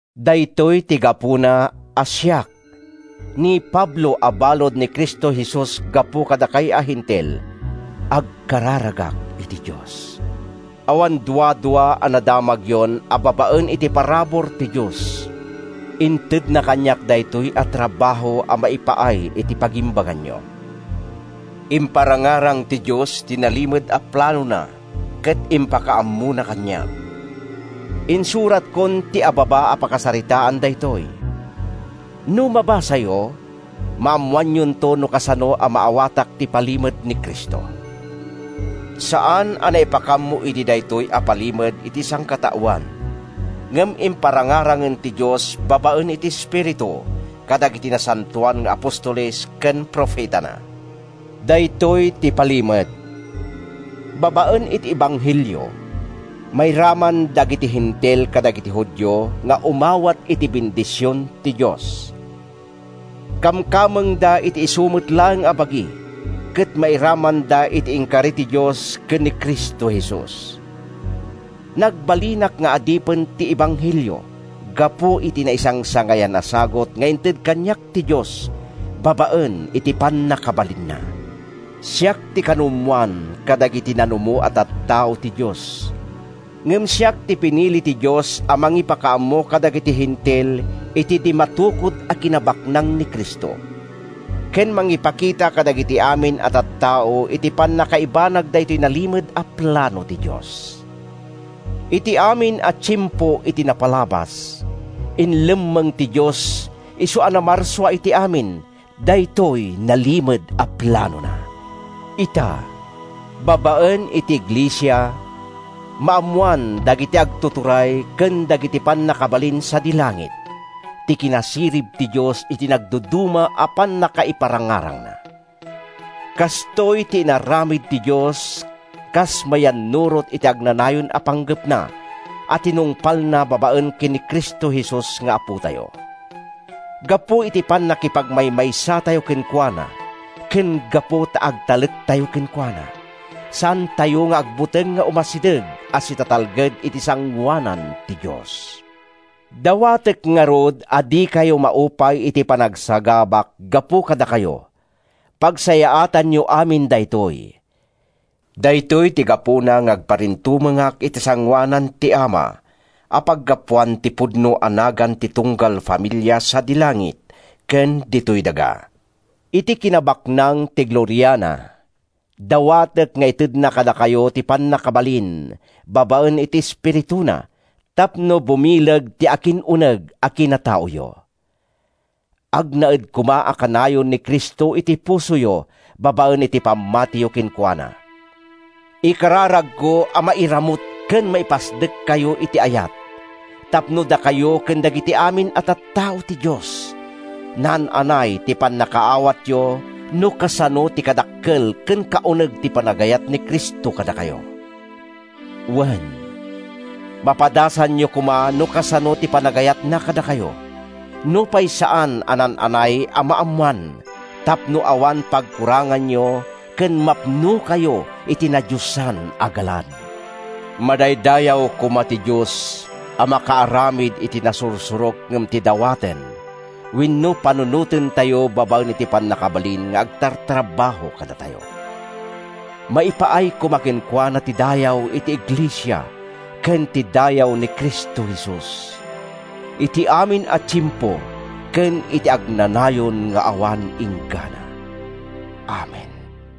Daytoy ti gapuna a siak, ni Pablo a balud ni Cristo Jesus gapu kadakay a Hentil, agkararagak iti Dios. Awan duadua a nadamagyon a babaen iti parabur ti Dios, intedna kaniak daytoy a trabaho a maipaay iti pagimbaganyo. Imparangarang ti Dios ti nalimed a planona ket impakaammona kaniak. (Insuratkon ti ababa a pakasaritaan daytoy. No mabasayo, maammoanyonto no kasano a maawatak ti palimed ni Cristo.) Saan a naipakaammo idi daytoy a palimed iti sangkataoan, ngem imparangarangen ti Dios babaen iti Espiritu kadagiti nasantoan nga apostoles ken profetana. Daytoy ti palimed: Babaen iti ebanghelio, mairaman dagiti Hentil kadagiti Judio nga umawat iti bendision ti Dios. Kamkamengda iti isu met laeng a bagi, ket mairamanda iti inkari ti Dios ken ni Cristo Jesus. Nagbalinak nga adipen ti ebanghelio gapu iti naisangsangayan a sagut nga inted kaniak ti Dios babaen iti pannakabalinna. Siak ti kanumoan kadagiti nanumo a tattao ti Dios, ngem siak ti pinili ti Dios a mangipakaammo kadagiti Hentil iti di matukod a kinabaknang ni Cristo, ken mangipakita kadagiti amin a tattao iti pannakaibanag daytoy nalimed a plano ti Dios. Iti amin a tiempo iti napalabas, inlemmeng ti Dios, isu a namarsua iti amin, daytoy nalimed a planona. Ita, babaen iti iglesia, maammoan dagiti agtuturay ken dagiti pannakabalin sadi langit ti kinasirib ti Dios iti nadumaduma a pannakaiparangarangna. Kastoy ti inaramid ti Dios kas mayannurot iti agnanayon a panggepna a tinungpalna babaen ken ni Cristo Jesus nga Apotayo. Gapu iti pannakipagmaymaysatayo kenkuana ken gapu ta agtalektayo kenkuana, saantayo nga agbuteng nga umasideg a sitatalged iti sangoanan ti Dios. Dawatek ngarud a dikayo maupay iti panagsagabak gapu kadakayo; pagsayaatanyo amin daytoy. Daytoy ti gapuna nga agparintumengak iti sangoanan ti Ama a paggapuan ti pudno a nagan ti tunggal familia sadi langit ken ditoy daga. Iti kinabaknang ti gloriana, dawatek nga itedna kadakayo ti pannakabalin babaen iti Espirituna tapno bumileg ti akin-uneg a kinataoyo. Agnaed koma a kanayon ni Cristo iti pusoyo babaen iti pammatiyo kenkuana. Ikararagko a mairamut ken maipasdekkayo iti ayat tapno dakayo ken dagiti amin a tattao ti Dios, naan-anay ti pannakaawatyo no kasano ti kadakkel ken kauneg ti panagayat ni Cristo kadakayo. Wen, mapadasanyo koma no kasano ti panagayatna kadakayo—nupay saan a naan-anay a maammoan, tapno awan pagkuranganyo ken mapnokayo iti nadiosan a galad. Madaydayaw koma ti Dios a makaaramid iti nasursurok ngem ti dawaten wenno panunotentayo babaen iti pannakabalin nga agtartrabaho kadatayo. Maipaay koma kenkuana ti dayaw iti iglesia ken ti dayaw ni Cristo Jesus, iti amin a tiempo ken iti agnanayon nga awan inggana. Amen.